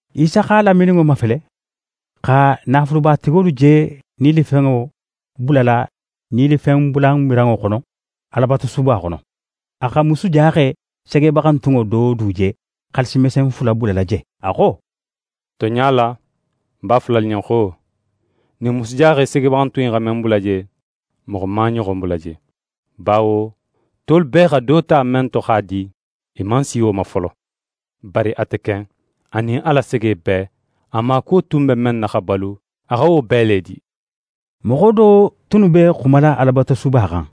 Isa x'a lamininŋo mafele, xa naafulubatigolu je nilifenŋo bulala nilifenbulamiranŋo xono, Alabatusuba xono. A xa musujaxe segebaxantunŋo do du je xaalisi mesen fula bulala je. A xo: «Tonɲa la, ń b'a fola alu ɲen xo: Ɲin musujaxe segebaxantun in xa men bula je, moxo man a ɲoxon bula je. Bawo tolu bee xa do ta men to x'a di, i man si wo ma folo; bari ate ken, a nin a la sege bee, a maakuwo tun be men na xa balu, a xa wo bee le di.» Moxo do tunnu be xumala Alabatusuba xan.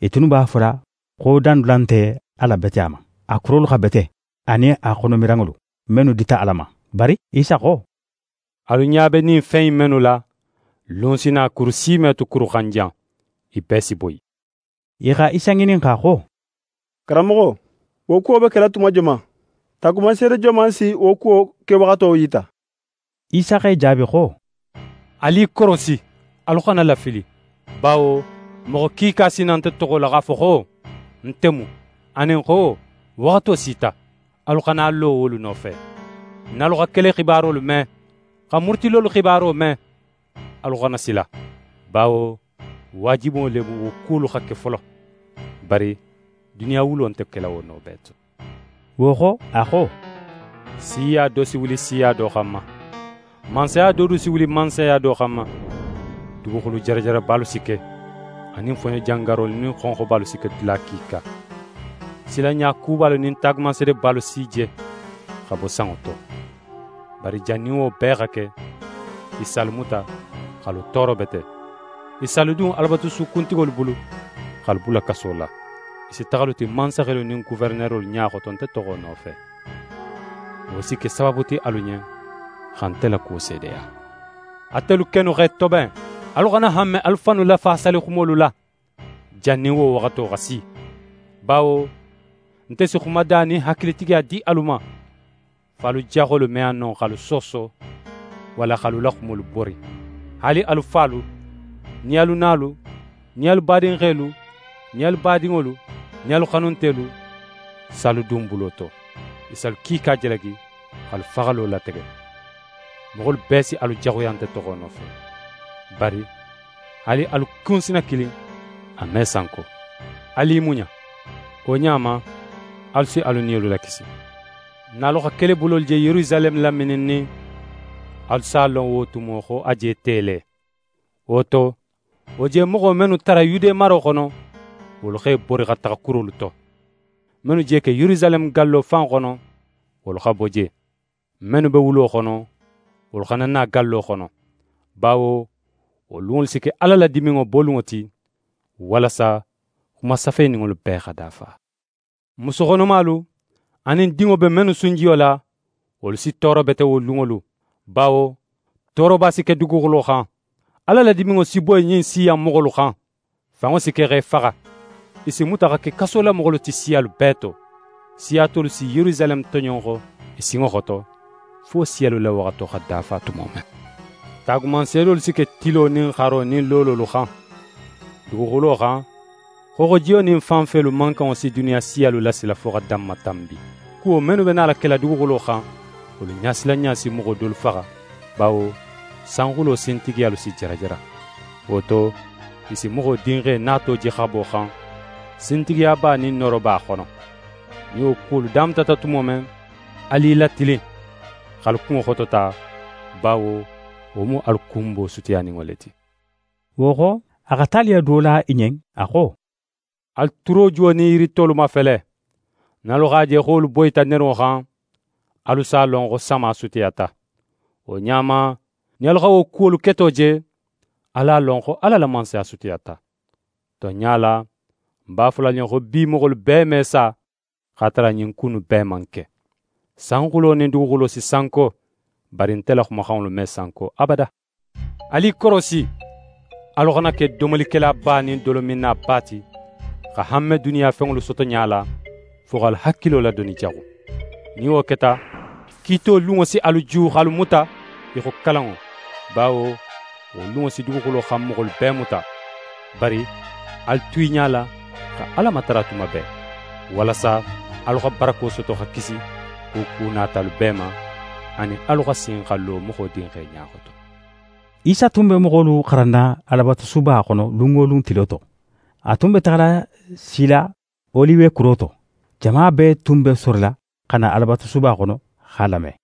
I tunnu b'a fola xo dandula nte a la beteya ma, a kurolu xa bete, anin a xono miranŋolu, mennu dita Ala ma. Bari Isa xo: «Alu ɲa be ɲin fen in mennu la, lun si na, kuru si me tu kuru xan jan, i bee si boyi.» I xa Isa ŋininxa xo: «Karanmoxo, wo kuwo be kela tuma joman? Taagumanseede joman si wo kuwo kewaxato yita?» Isa x'e jaabi xo: «Alu i korosi, alu xana lafili. Bawo moxo kiika si na nte toxo la, x'a fo xo: “Nte mu”, anin xo: “Waxato sita”. Alu xana a lo wolu nofe. Nin alu xa kelexibarolu me, xa murutilolu xibaro me, alu xana sila. Bawo waajibo le mu, wo kuwolu xa ke folo, bari duniya wulo nte kela wo no bee to.» Wo xo, a xo: «Siya do si wuli siya do xanma, mansaya do du si wuli mansaya do xanma. Duguxulu jarajarabalu si ke, anin foɲo jangarolu nin xonxobalu si ke dula kiika. Silanɲa kubalu nin taagumanseedebalu si je xa bo sanŋo to. «Bari jannin wo bee xa ke, i si alu muta, x'alu tooro bete. I si alu dun Alabatusu kuntigolu bulu, x'alu bula kaso la. I si taxa alu ti mansaxelu nin goferenerolu ɲa xoto nte toxo nofe. Wo si ke sabaabu ti alu ɲen, xa nte la kuwo seedeya. Atelu kennu x'e toben. Alu xana hanme alu fannu lafaasalixumolu la jannin wo waxato xa si; bawo nte si xumada nin hakilitigiya di alu ma, fo alu jaxolu me a no x'alu sooso, walla x'alu la xumolu bori. Haali alu falu, nin alu nalu, nin alu badinxelu, nin alu badinŋolu nin alu xanuntelu si alu dun bulo to. I si alu kiika jalagi, x'alu faxalo latege. Moxolu bee si alu jaxuya nte toxo nofe. Bari haali alu kunsina kilin, a me sanko. Alu i muɲa! Wo ɲa ma, alu si alu niyolu lakisi.» «Nin alu xa kelebulolu je Yerusaleme lamininnin, alu s'a lon wo tumo xo a je te le. Wo to, wo je moxo mennu tara Yude maro xono, wolu x'e bori xa taxa kurolu to. Mennu je ke Yerusaleme gallo fan xono, wolu xa bo je. Mennu be wulo xono, wolu xana na gallo xono. Bawo wo lunŋolu si ke Ala la diminŋo bolunŋo ti, walasa xuma safeninŋolu bee xa dafa. Musu xonomalu, anin dinŋo be mennu sunjiyo la, wolu si tooro bete wo lunŋolu! Bawo tooroba si ke duguxulo xan. Ala la diminŋo si boyi ɲin siya in moxolu xan. Fanŋo si ke x'e faxa, i si muta xa ke kasolamoxolu ti siyalu bee to. Siya tolu si Yerusaleme toɲonxo i sinŋo xoto, fo siyalu la waxato xa dafa tumo men. «Taagumanseedolu si ke tilo nin xaro nin loololu xan. Duguxulo xan, xooxojiyo nin fanfelu mankanŋo si duniya siyalu lasila fo xa danmatanbi. Kuwo mennu be nala kela duguxulo xan, wolu ɲasilanɲa si moxo dolu faxa, bawo sanxulo sintigiyalu si jarajara. Wo to, i si Moxo Dinxe nato je xabo xan, sintigiyaba nin nooroba xono. Nin wo kuwolu damutata tumo men, alu i latilin x'alu kunŋo xotota, bawo wo mu alu kunbo sutiyaninŋo le ti.» Wo xo, a xa taliyo do la i ɲen. A xo: «Alu turojuwo nin yiri tolu mafele. Nin alu x'a je xo wolu boyita nerunŋo xan, alu s'a lon xo sama sutiyata. Wo ɲa ma, nin alu xa wo kuwolu keto je, alu a lon xo Ala la Mansaya sutiyata. Tonɲa la, ń b'a fola alu ɲen xo bi moxolu bee me sa, x'a tara ɲin ku innu bee man ke. Sanxulo nin duguxulo si sanko, bari nte la xumaxanŋolu me sanko abada.» «Alu i korosi! Alu xana ke domolikelaba nin dolominnaba ti, xa hanme duniya fenŋolu sotoɲa la, fo x'alu hakilo ladoni jaxu. Nin wo keta, kiito lunŋo si alu ju x'alu muta, í xo kalanŋo; bawo wo lunŋo si duguxulo xan moxolu bee muta. Bari alu tu i ɲala xa Ala matara tuma bee, walasa alu xa barako soto xa kisi wo ku natalu bee ma, anin alu xa sin xa lo Moxo Dinxe ɲa xoto.» Isa tun be moxolu xaranna Alabatusuba xono lun wo lun tilo to. A tun be taxala sila Oliwe kuro to. Jama bee tun be sorila xa na Alabatusuba xono x'a lame.